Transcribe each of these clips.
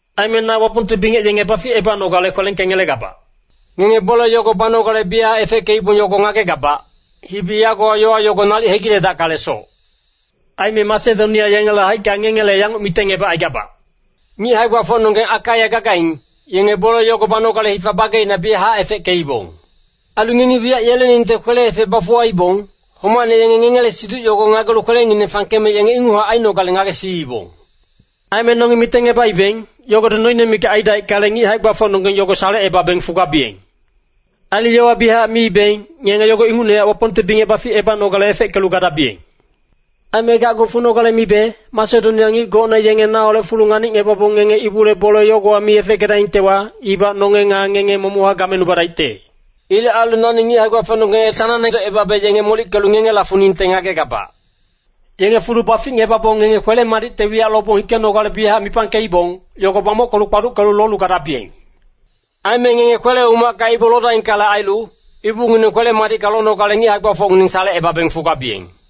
Aime na Wapongte bingec yenge baficebanogale kwelengkengelegabac. Ngenge bole yogo banogale biyachac efeckeibong yogo ngagegabac, hibi yagowa yowa yogo nalic hegiledackalesoc. Aime Masedonia yengele haicka ngengele yanguc mitengngebacaigabac, “Ngic hae-gbafocnonggeng Akaia gagaing, yenge bole yogo banogale hifa bageina biyachac efeckeibong.” Ailu ngengi wiyac yeleningte kwele-efec bafuwaibong, homacne yenge ngengele siduc yogo ngagelu kwelengineng fangkeme yenge inguchac ainogale ngagesiibong. Aime nongi mitengngebaibeng, yogodi noine mikac aidaickale, ngic hae-gbafocnonggeng yogo salecebabeng fugabiyeng. Ailu yowa biyachac miibeng, ngenge yogo ingucnehac Wapongte bingec baficebanogale efeckelu gadabiyeng. Aime gacgu funogale mibe, Masedonia ngic gocne yenge naholec fulu nganicngebabong ngenge ibule bole yogowa mi efeckedaingtewa, ibac nonge nga ngenge momochac gamenubadaicte. Ilec ailu nani ngic hae-gbafocnonggeng sanangne edocebabe yenge molickelu ngengela funingte ngagegabac. Yenge fulu baficngebabong ngenge kwele-madicte wiyac lobong hikenogale biyachac mipangkeibong, yogo bamockelu kpaduckelu lolu gadabiyeng. Aime ngenge kwele-umacka ibu lodaingkale ailu, ibungineng kwele-madicka lonogale ngic hae-gbafocnonggeng salecebabeng fugabiyeng.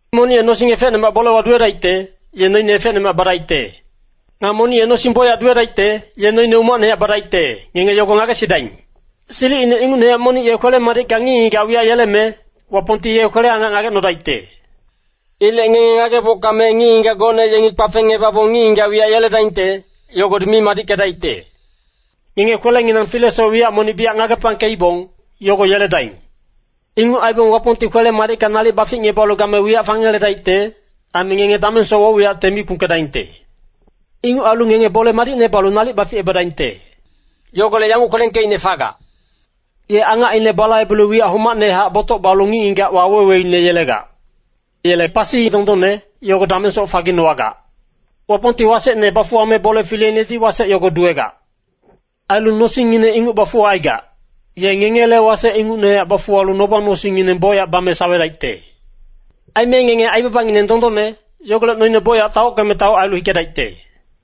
Monic ye nosing efecnemac bolewa duwedaicte, ye noine efecnemac badaicte. Nga monic ye nosing bocyac duwedaicte, ye noine umacnehac badaicte, ngenge yogo ngagesidaing. Silicine ingucnehac monic ye kwele-madicka ngic-ngigac wiyac yeleme, Wapongti yele kwele-angac ngagecnodaicte. Ilec ngenge ngagebocka me ngic-ngigac gocne yengi kpafengngebabong ngic-ngigac wiyac yeledaingte, yogodi mi madickedaicte. Ngenge kwelenginang filesoc wiyac monic biyac ngagepangkeibong, yogo yeledaing. Inguc aibong Wapongti kwele-madicka nalic baficngebalu game wiyac fangeledaicte, aime ngenge damengsoc woc-wiyacte mi kpungkedaingte. Inguc ailu ngenge bole madicne balu nalic baficebadaingte. Yogolec yanguc kwelengkeicne fagac, “Ye angacine balaibelu wiyac homacnehac botoc balu ngic-ngigac waweweine yelegac. Yele pasi dondonne, yogo damengsoc faginowagac.” Wapongti wasecne bafuwame bole fileinedi wasec yogo duwegac. Ailu nosingngine inguc bafuwacaigac, ye ngengele wasec ingucnehac bafuwalu noba-nosingngineng bocyac bame sawedaicte. Aime ngenge aibabangineng dondonne, yogolec noine bocyac taockeme taoc ailu hikedaicte.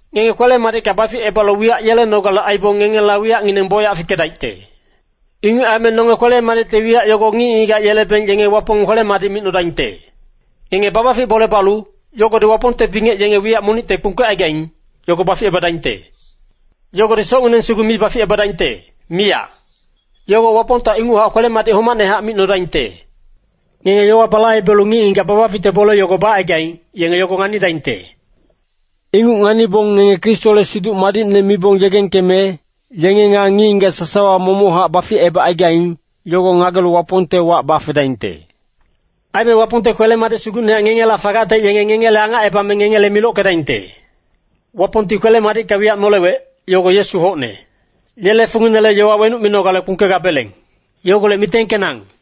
Ngenge kwele-madicka baficebalu wiyac yelenogale aibong ngengela wiyacngineng bocyac fikedaicte. Inguc aime nonge kwele-madicte wiyac yogo ngic-ngigac yelebeng yenge Wapong kwele-madic micnodaingte. Ngenge babafic bole balu, yogodi Wapongte bingec yenge wiyac monicte kpungkecaigaing, yogo baficebadaingte. Yogodi socngineng sugu mi baficebadaingte, miyac. Yogo Wapongta inguchac kwele-madic homacnehac micnodaingte. Ngenge yowa balaibelu ngic-ngigac babaficte bole yogo bacaigaing, yenge yogo nganidaingte. Inguc nganibong ngenge Kristole Siduc Madicne mibong yegengkeme, yenge nga ngic-ngigac sasawa momochac baficebacaigaing, yogo ngagelu Wapongte wac bafedaingte. Aime Wapongte kwele-madic sugucnehac ngengela fagacte yenge ngengele angacebame ngengele milockedaingte. Wapongti kwele-madicka wiyac nolewec, yogo Yesu hocne. Yele funginele yowa wenuc minogale kpungkegabeleng. Yogolec mitengkenang.